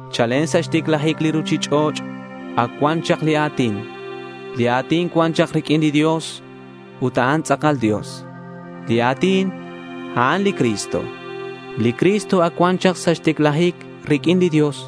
Chalen chak sa' xticlajic li ruchich'och' ac cuan chak li A̱tin. Li A̱tin cuan chak riq'uin li Dios ut a'an tz'akal Dios. Li A̱tin, a'an li Cristo. Li Cristo ac cuan chak sa' xticlajic riq'uin li Dios.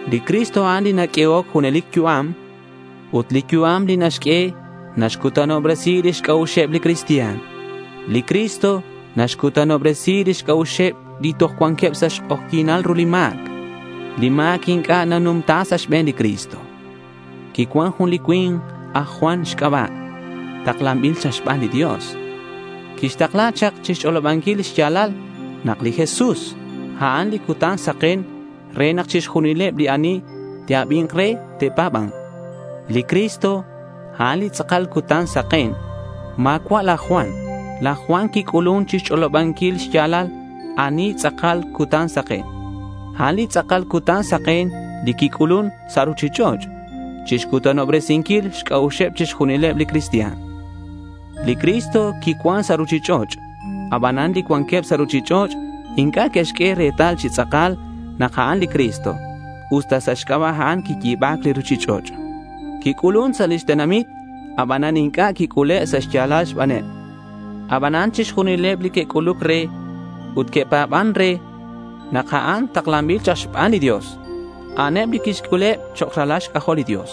Li Cristo, a'an li naq'uehoc junelic yu'am. Ut li yu'am li naxq'ue naxcutanobresi lix c'a'uxeb li cristian. Li Cristo naxcutanobresi lix c'a'uxeb li toj cuanqueb sa' xk'ojyi̱nal ru li ma̱c. Li ma̱c inc'a' quinumta sa' xbe̱n li Cristo. Quicuan jun li cui̱nk aj Juan xc'aba' taklanbil chak xban li Dios. Quitakla̱c chak chixch'olobanquil xya̱lal nak li Jesús, a'an li cutan saken re nak chixjunileb li ani te'abi̱nk re, te'pa̱ba̱nk. Li Cristo, a'an li tz'akal cutan saken. Ma̱cua' laj Juan. Laj Juan quic'ulun chixch'olobanquil xya̱lal ani li tz'akal cutan saken. A'an li tz'akal cutan saken li quic'ulun sa' ruchich'och' chixcutanobresinquil xc'a'uxeb chixjunileb li cristian. Li Cristo quicuan sa' ruchich'och'. Abanan li cuanqueb sa' ruchich'och' inc'a' que'xq'ue retal chi tz'akal nak a'an li Cristo usta sa' xc'aba' a'an quiyi̱ba̱c li ruchich'och'. Quic'ulun sa' lix tenamit. Abanan inc'a' quic'ule' sa' xya̱lal xbaneb. Abanan chixjunileb li que'c'uluc re ut que'pa̱ban re nak a'an taklanbil chak xban li Dios, a'aneb li quixc'uleb chok' ralal xc'ajol li Dios.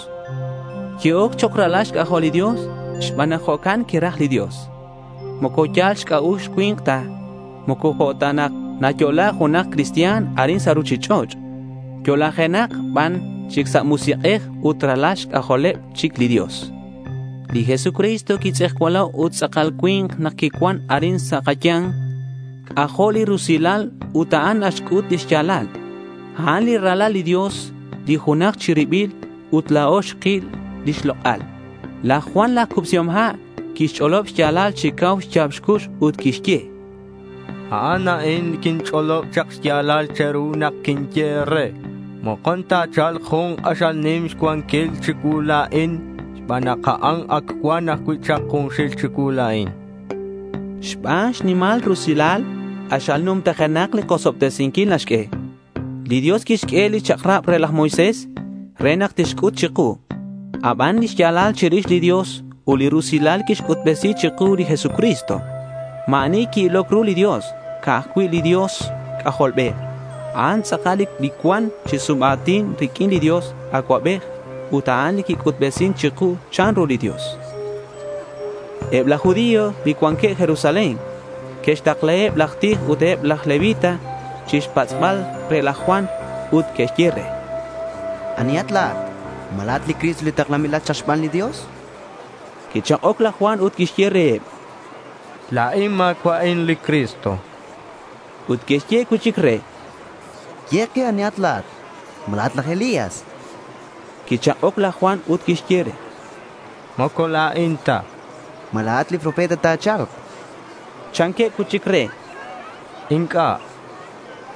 Que'oc chok' ralal xc'ajol li Dios xban nak jo'can quiraj li Dios. Moco yal xc'a'ux cui̱nk ta. Moco jo' ta nak nayo'la junak cristian arin sa' ruchich'och'. Yo'lajenakeb ban chic sa' musik'ej ut ralal xc'ajoleb chic li Dios. Li Jesucristo quitz'ejcualo' ut tz'akal cui̱nk nak quicuan arin sa' kaya̱nk. C'ajo' li rusilal ut a'an naxc'ut li xya̱lal. A'an li Ralal li Dios li junaj chi ribil ut la̱o xkil lix lok'al. Laj Juan laj Cubsihom Ha' quixch'olob xya̱lal chi cau xya̱b xcux ut quixye: —A'an a'in li quinch'olob chak xya̱lal che̱ru nak quinye e̱re: Mokon ta̱cha̱lk jun k'axal nim xcuanquil chicuu la̱in xban nak a'an ac cuan ajcui' chak junxil chicuu la̱in, chan. Xban xnimal rusilal, k'axal numtajenak li kosobtesinquil naxq'ue. Li Dios quixq'ue li chak'rab re laj Moisés re nak tixc'ut chiku. Aban li xya̱lal chirix li Dios ut li rusilal quixc'utbesi chiku li Jesucristo. Ma̱ ani qui-iloc ru li Dios. Ca'aj cui' li Dios C'ajolbej, a'an tz'akal li cuan chi sum a̱tin riq'uin li Dios Acuabej. Ut a'an li quic'utbesin chiku chanru li Dios. Eb laj judío li cuanqueb Jerusalén que'xtaklaheb laj tij ut eb laj levita chixpatz'bal re laj Juan, ut que'xye re: —¿Anihat la̱at? ¿Ma la̱at li Cristo li taklanbil chak xban li Dios? chanqueb re. Quichak'oc laj Juan ut quixye reheb: —La̱in ma̱cua'in li Cristo, chan. Ut que'xye cui'chic re: —Ye ke anihat la̱at. ¿Ma la̱at laj Elías?— Quichak'oc laj Juan ut quixye: —Moco la̱in ta, chan. —¿Ma la̱at li profeta li ta̱cha̱lk? chanqueb cui'chic re. —Inc'a', chan laj Juan.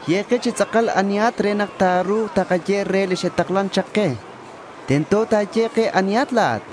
—Ye ke chi tz'akal anihat re nak ta̱ru̱k takaye reheb li xe'taklan chak ke. Tento nak ta̱ye ke anihat, chanqueb.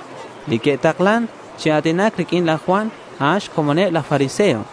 Li que'takla̱c chi a̱tinac riq'uin laj Juan, a'an xcomoneb laj fariseo.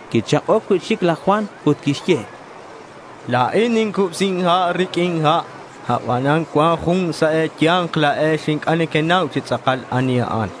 Quichak'oc cui'chic laj Juan ut quixye: —La̱in nincubsin ha' riq'uin ha'. Abanan cuan jun sa' e̱ya̱nk la̱ex inc'a' nequenau chi tz'akal ani a'an.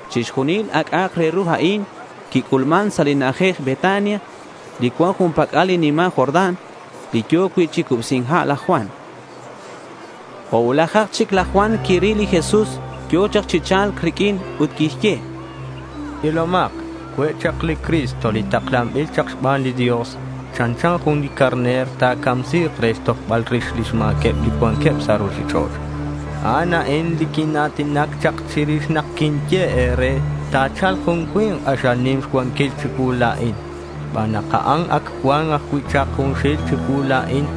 Chixjunil a c'a'ak re ru a'in quic'ulman sa' li na'ajej Betania li cuan jun pac'al li nima' Jordán, li yo̱ cui' chi cubsi̱nc ha' laj Juan. Jo' cuulajak chic laj Juan quiril li Jesús yo̱ chak chi cha̱lc riq'uin ut quixye: —Ilomak. Cue' chak li Cristo, li taklanbil chak xban li Dios. Chanchan jun li carner. Ta̱camsi̱k re xtojbal rix lix ma̱queb li cuanqueb sa' ruchich'och'. A'an a'in li quina̱tinac chak chirix nak quinye e̱re nak ta̱cha̱lk jun cui̱nk k'axal nim xcuanquil chicuu la̱in xban nak a'an ac cuan ajcui' chak junxil chicuu la̱in.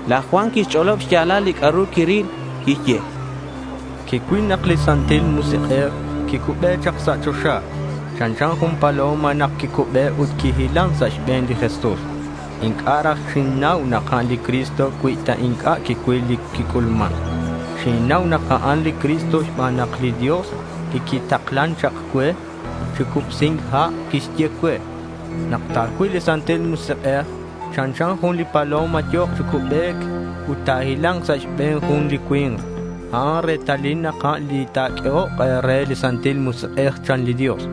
Laj Juan quixch'olob xya̱lal li c'a'ru quiril. Quixye: —Quicuil nak li Santil Musik'ej quicube chak sa' choxa. Chanchan jun li paloma nak quicube ut quihilan sa' xbe̱n li Jesús. Inc'a' raj xinnau nak a'an li Cristo cui ta inc'a' quicuil li quic'ulman. Xinnau nak a'an li Cristo xban nak li Dios li quitaklan chak cue chi cubsi̱nc ha' quixye cue, “Nak ta̱cuil li Santil Musik'ej chanchan jun li paloma yo̱k chi cubec ut ta̱hila̱nk sa' xbe̱n jun li cui̱nk, a'an retalil nak a'an li ta̱q'uehok e̱re li Santil Musik'ej”, chan li Dios.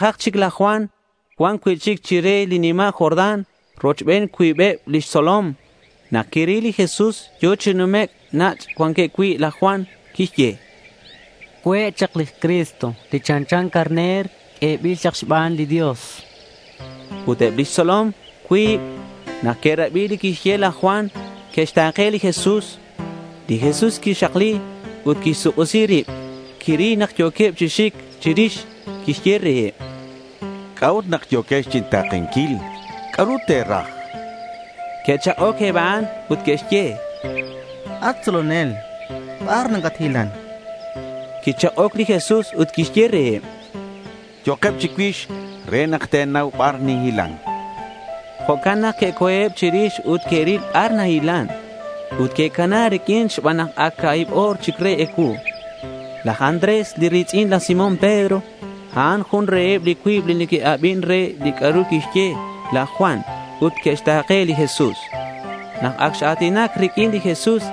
Jo' cuulajak chic laj Juan cuan cui'chic chire li nima' Jordán rochben cuibeb lix tzolom. Nak quiril li Jesús yo̱ chi numec' nach' cuanqueb cui', laj Juan quixye: —Cue' chak li Cristo, li chanchan Carner q'uebil chak xban li Dios, chan. Ut eb lix tzolom cuib, nak que'rabi li quixye laj Juan, que'xta̱ke li Jesús. Li Jesús quixakli ut quixsuk'isi rib. Quiril nak yo̱queb chi xic chirix. Quixye reheb: —¿C'a'ut nak yo̱quex chinta̱kenquil? ¿C'a'ru te̱raj? chan reheb. Que'chak'oc eb a'an ut que'xye: —At tzolonel ¿bar nacathilan? chanqueb re. Quichak'oc li Jesús ut quixye reheb: —Yo'keb chicuix re nak te̱nau bar ninhilan, chan li Jesús reheb. Jo'can nak que'co̱eb chirix ut que'ril bar nahilan. Ut que'cana riq'uin xban nak ac ca̱hib o̱r chic re ecuu. Laj Andrés li ri̱tz'in laj Simón Pedro, a'an jun reheb li cuib li que'abin re li c'a'ru quixye laj Juan ut que'xta̱ke li Jesús. Nak ac x-a̱tinac riq'uin li Jesús,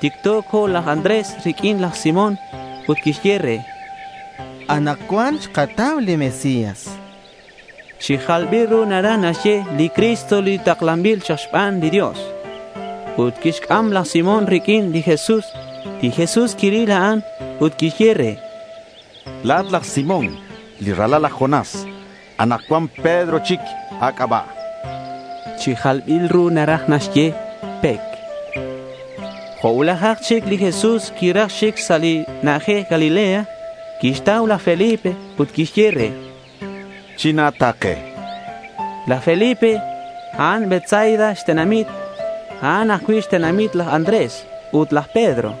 ticto co̱ laj Andrés riq'uin laj Simón ut quixye re: —Anakcuan xkatau li Mesías, chan. (Chi jalbil ru naraj naxye “li Cristo li taklanbil chak xban li Dios”.) Ut quixc'am laj Simón riq'uin li Jesús. Li Jesús quiril a'an ut quixye re: —La̱at laj Simón li ralal laj Jonás. Anakcuan Pedro chic a̱c'aba'.— (Chi jalbil ru naraj naxye “Pec”.) Jo' cuulajak chic li Jesús quiraj xic sa li na'ajej Galilea. Quixtau laj Felipe ut quixye re: —China̱ta̱ke, chan. Laj Felipe, a'an Betsaida xtenamit. A'an ajcui' xtenamiteb laj Andrés ut laj Pedro.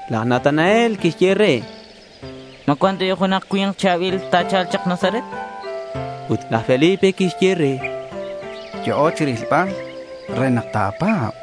Laj Natanael quixye re: —¿Ma cuan ta bi' junak cha̱bil ta̱cha̱lk chak Nazaret? chan. Ut laj Felipe quixye re: —Yo'o rilbal re nak ta̱pa̱b, chan.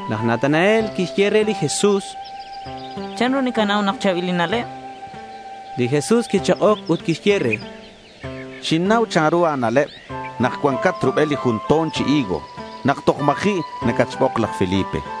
Laj Natanael quixye re li Jesús: —¿Chanru nacanau nak cha̱bil inna'leb? chan. Li Jesús quichak'oc ut quixye re: —Xinnau chanru a̱na'leb nak cuancat rubel li jun to̱n chi higo nak toj ma̱ji' nacatxbok laj Felipe, chan.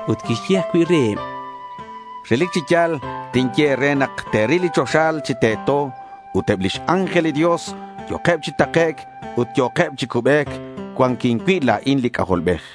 Ut quixye ajcui' reheb: —Relic chi ya̱l tinye e̱re nak te̱ril li choxa chi teto. Ut eb lix ángel li Dios yo̱keb chi takec' ut yo̱keb chi cubec cuanquin cui' la̱in li C'ajolbej, chan li Jesús reheb.